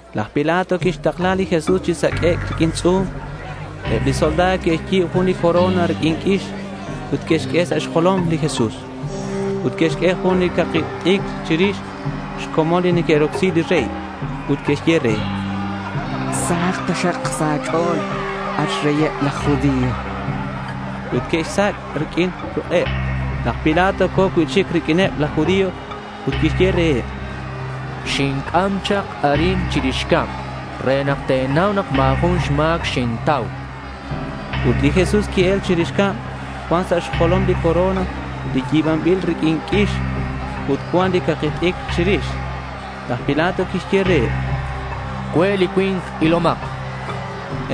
Laj Pilato quixtakla li Jesús chi saq'uec' riq'uin tz'u̱m. Eb li soldado que'xyi̱b jun li corona riq'uin q'uix ut que'xq'ue sa' xjolom li Jesús. Ut que'xq'ue jun li caki t'icr chirix xcomon li neque'rocsi li rey. Ut que'xye re: —¡Sahak taxak sa' a̱ch'o̱l, at xreyeb laj judío! chanqueb re. Ut que'xsac' riq'uin ruk'eb. Laj Pilato co̱ cui'chic riq'uineb laj judío ut quixye reheb: —Xinc'am chak arin chirix cab re nak te̱nau nak ma̱ jun xma̱c xintau, chan. Ut li Jesús qui-el chirix cab. Cuan sa' xjolom li corona li yi̱banbil riq'uin q'uix ut cuan li caki t'icr chirix. Laj Pilato quixye reheb: —Cue' li cui̱nk. Ilomak, chan.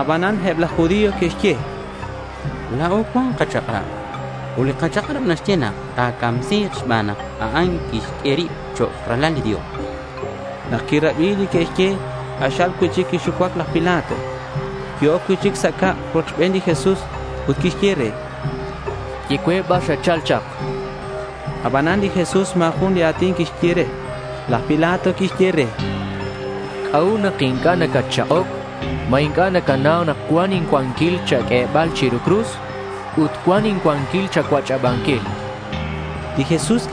Abanan eb laj judío que'xye: —La̱o cuan kachak'rab ut li kachak'rab naxye nak ta̱camsi̱k xban nak a'an quixq'ue rib chok' Ralal li Dios.— Nak quirabi li que'xye, k'axal cui'chic quixucuac laj Pilato. Qui-oc cui'chic sa' cab rochben li Jesús ut quixye re: —Ye cue bar xatchal chak.— Abanan li Jesús ma̱ jun li a̱tin quixye. Laj Pilato quixye re: —¿C'a'ut nak inc'a' nacatchak'oc? ¿Ma inc'a' nacanau nak cuan incuanquil cha̱q'uebal chiru cruz ut cuan incuanquil cha̱cuach'abanquil? chan re li Jesús.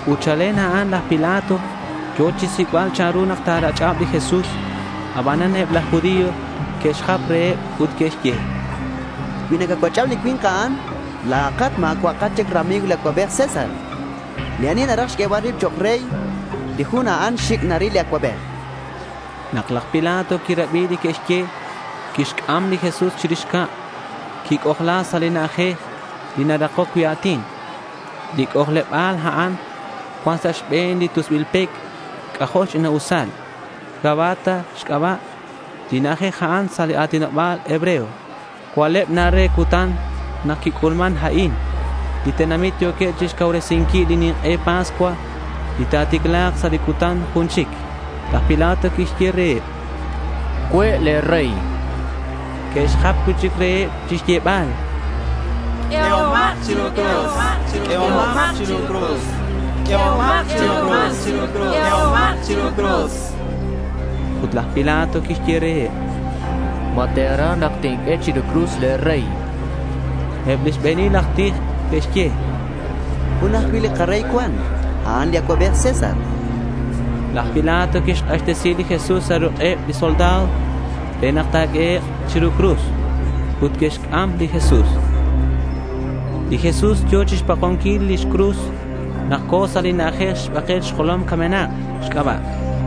Ut chalen a'an laj Pilato yo̱ chixsic'bal chanru nak ta̱rach'ab li Jesús. Abanan eb laj judío que'xjap reheb ut que'xye: —Cui nacacuach'ab li cui̱nk a'an, la̱at ma̱cua'akat chic rami̱g li Acuabej César. Li ani naraj xq'uebal rib chok' rey, li jun a'an xic' chic naril li Acuabej, chanqueb. Nak laj Pilato quirabi li que'xye, quixc'am li Jesús chirix cab. Quic'ojla sa' li na'ajej li narakoc cui' a̱tin. Li c'ojleba̱l a'an cuan sa' xbe̱n li tusbil pec. C'ajo' xch'ina'usal. Gabata xc'aba' li na'ajej a'an sa' li a̱tinoba̱l hebreo. Cua'leb na re cutan nak quic'ulman a'in. Li tenamit yo̱queb chixcauresinquil li nink'e Pascua, li ta̱ticla̱k sa' li cutan jun chic. Laj Pilato quixye reheb: —Cue' le̱ rey, chan. Que'xjap cui'chic reheb chixyebal: —¡Q'ueomak chiru cruz! ¡Q'uehomak chiru cruz! Ut laj Pilato quixye reheb: —¿Ma te̱raj nak tinq'ue chiru cruz le̱ rey? chan. Eb li xbe̱nil aj tij que'xye: —Jun ajcui' li karey cuan. A'an li Acuabej César, chanqueb. Laj Pilato quixk'axtesi li Jesús sa' ruk'eb li soldado re nak ta̱q'uehek' chiru cruz. Ut que'xc'am li Jesús. Li Jesús yo̱ chixpakonquil lix cruz nak co̱ sa' li na'ajej Xbakel Xjolom Camenak xc'aba'.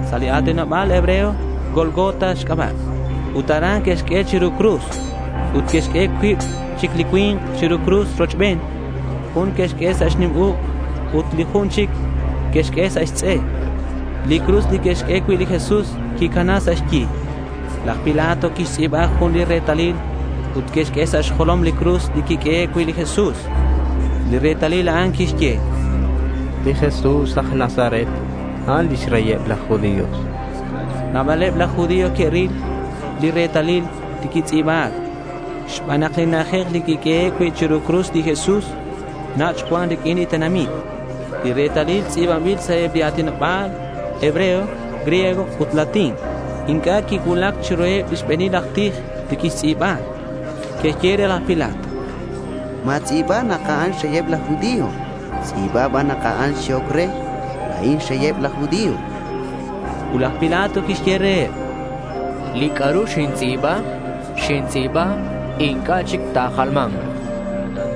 Sa' li a̱tinoba̱l hebreo Gólgota xc'aba'. Ut aran que'xq'ue chiru cruz. Ut que'xq'ue cuib chic li cui̱nk chiru cruz rochben. Jun que'xq'ue sa' xnim uk' ut li jun chic que'xq'ue sa' xtz'e. Li cruz li que'xq'ue cui' li Jesús quicana sa' xyi. Laj Pilato quixtz'i̱ba jun li retalil ut que'xq'ue sa' xjolom li cruz li quiq'uehe' cui' li Jesús. Li retalil a'an quixye: Li Jesús aj Nazaret, a'an lix reyeb laj judío. Nabaleb laj judío que'ril li retalil li quitz'i̱ba̱c, xban nak li na'ajej li quiq'uehe' cui' chiru cruz li Jesús nach' cuan riq'uin li tenamit. Li retalil tz'i̱banbil sa' eb li a̱tinoba̱l hebreo, griego ut latín. Inc'a' quicuulac chiruheb lix xbe̱nil aj tij li quixtz'i̱ba. Que'xye re laj Pilato: —Ma̱tz'i̱ba nak a'an xreyeb laj judío. Tz'i̱ba ban nak a'an xyehoc re, “La̱in xreyeb laj judío”, chanqueb. Ut laj Pilato quixye reheb: —Li c'a'ru xintz'i̱ba, xintz'i̱ba. Inc'a' chic ta̱jalma̱nk, chan.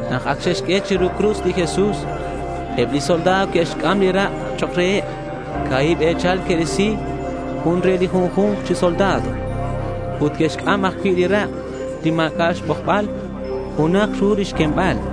Nak ac xe'xq'ue chiru cruz li Jesús, eb li soldado que'xc'am li rak' chok' reheb. Ca̱hib e̱chal que'risi, jun re li junju̱nk chi soldado. Ut que'xc'am ajcui' li rak' li ma̱c'a' xbojbal. Junaj ru lix quembal.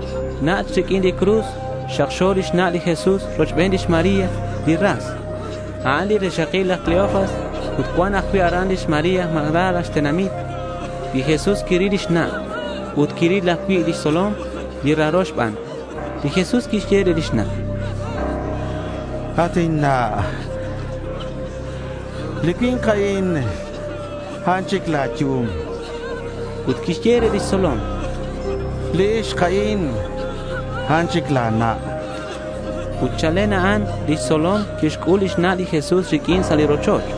Nach' riq'uin li cruz xakxo li xna' li Jesús rochben lix María li ras. A'an li rixakil laj Cleofas. Ut cuan ajcui' aran lix María, Magdala xtenamit. Li Jesús quiril lix na' ut quiril ajcui' lix tzolom li raro xban. Li Jesús quixye re lix na': —At inna', li cui̱nk a'in, a'an chic la̱ yum.— Ut quixye re lix tzolom: —Li ixk a'in, a'an chic la̱ na'.— Ut chalen a'an lix tzolom quixc'ul lix na' li Jesús riq'uin sa' li rochoch.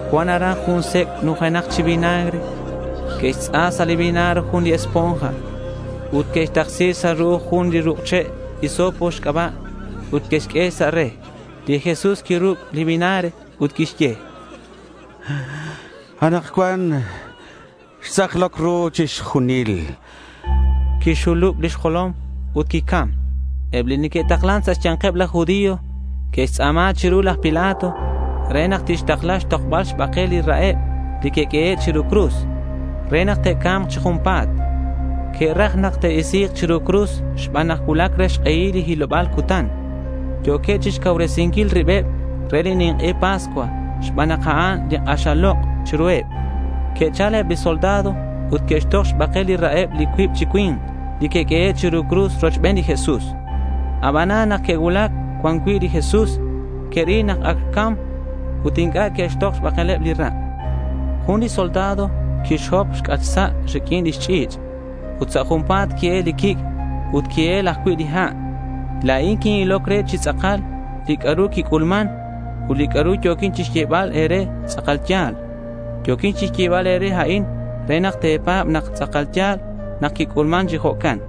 Cuan aran jun sec' nujenak chi vinagre. Que'xtz'a sa' li vinagre jun li esponja ut que'xtaksi sa' ru'uj jun li ruk' che' hisopo xc'aba' ut que'xq'ue sa' re. Li Jesús quiruc' li vinagre ut quixye: —Anakcuan xtz'akloc ru chixjunil.— Quixxulub lix jolom ut quicam. Eb li neque'taklan sa' xya̱nkeb laj judío que'xtz'a̱ma chiru laj Pilato re nak tixtakla xtokbal xbakel li ra'eb li que'q'uehe' chiru cruz re nak te'ca̱mk chi junpa̱t. Que'raj nak te'isi̱k chiru cruz xban nak cuulac re li hiloba̱l cutan. Yo̱queb chixcauresinquil ribeb re li nink'e Pascua xban nak a'an li k'axal lok' chiruheb. Que'chal eb li soldado ut que'xtok xbakel li ra'eb li cuib chi cui̱nk li que'q'uehe' chiru cruz rochben li Jesús. Abanan nak que'cuulac cuan cui' li Jesús, que'ril nak ac xcam ut inc'a' que'xtok xbakel li ra'. Jun li soldado quixhop xc'atk xsa' riq'uin lix ch'i̱ch' ut sa' junpa̱t qui-el li quic' ut qui-el ajcui' li ha'. La̱in quin-iloc re chi tz'akal li c'a'ru quic'ulman ut li c'a'ru yo̱quin xyebal e̱re tz'akal ya̱l. Yo̱quin chixyebal e̱re a'in re nak te̱pa̱b nak tz'akal ya̱l nak quic'ulman chi jo'can.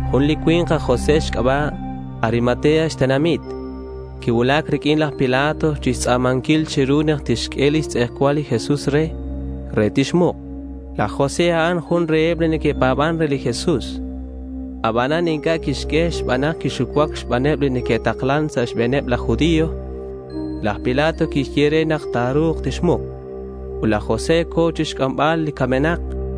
Jun li cui̱nk aj José xc'aba' Arimatea xtenamit quicuulac riq'uin laj Pilato chixtz'a̱manquil chiru nak tixq'ue lix tz'ejcual li Jesús re, re tixmuk. Laj José, a'an jun reheb li neque'pa̱ban re li Jesús. Abanan inc'a' quixye xban nak quixucuac xbaneb li neque'taklan sa' xbe̱neb laj judío. Laj Pilato quixye re nak ta̱ru̱k tixmuk, ut laj José co̱ chixc'ambal li camenak.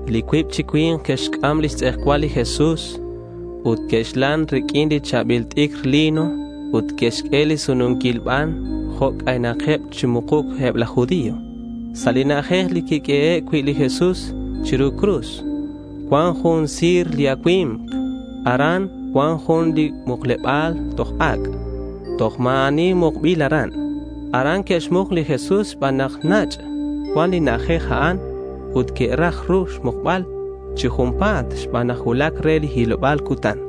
Li cuib chi cui̱nk que'xc'am lix tz'ejcual li Jesús ut que'xlan riq'uin li cha̱bil t'icr lino ut que'xq'ue li sununquil ban jo' c'aynakeb chi mukuc eb laj judío. Sa' li na'ajej li quiq'uehe' cui' li Jesús chiru cruz cuan jun si̱r li acui̱mk. Aran cuan jun li mukleba̱l toj ac'. Toj ma̱ ani mukbil aran. Aran que'xmuk li Jesús xban nak nach' cuan li na'ajej a'an ut que'raj ru xmukbal chi junpa̱t xban nak cuulac re li hiloba̱l cutan.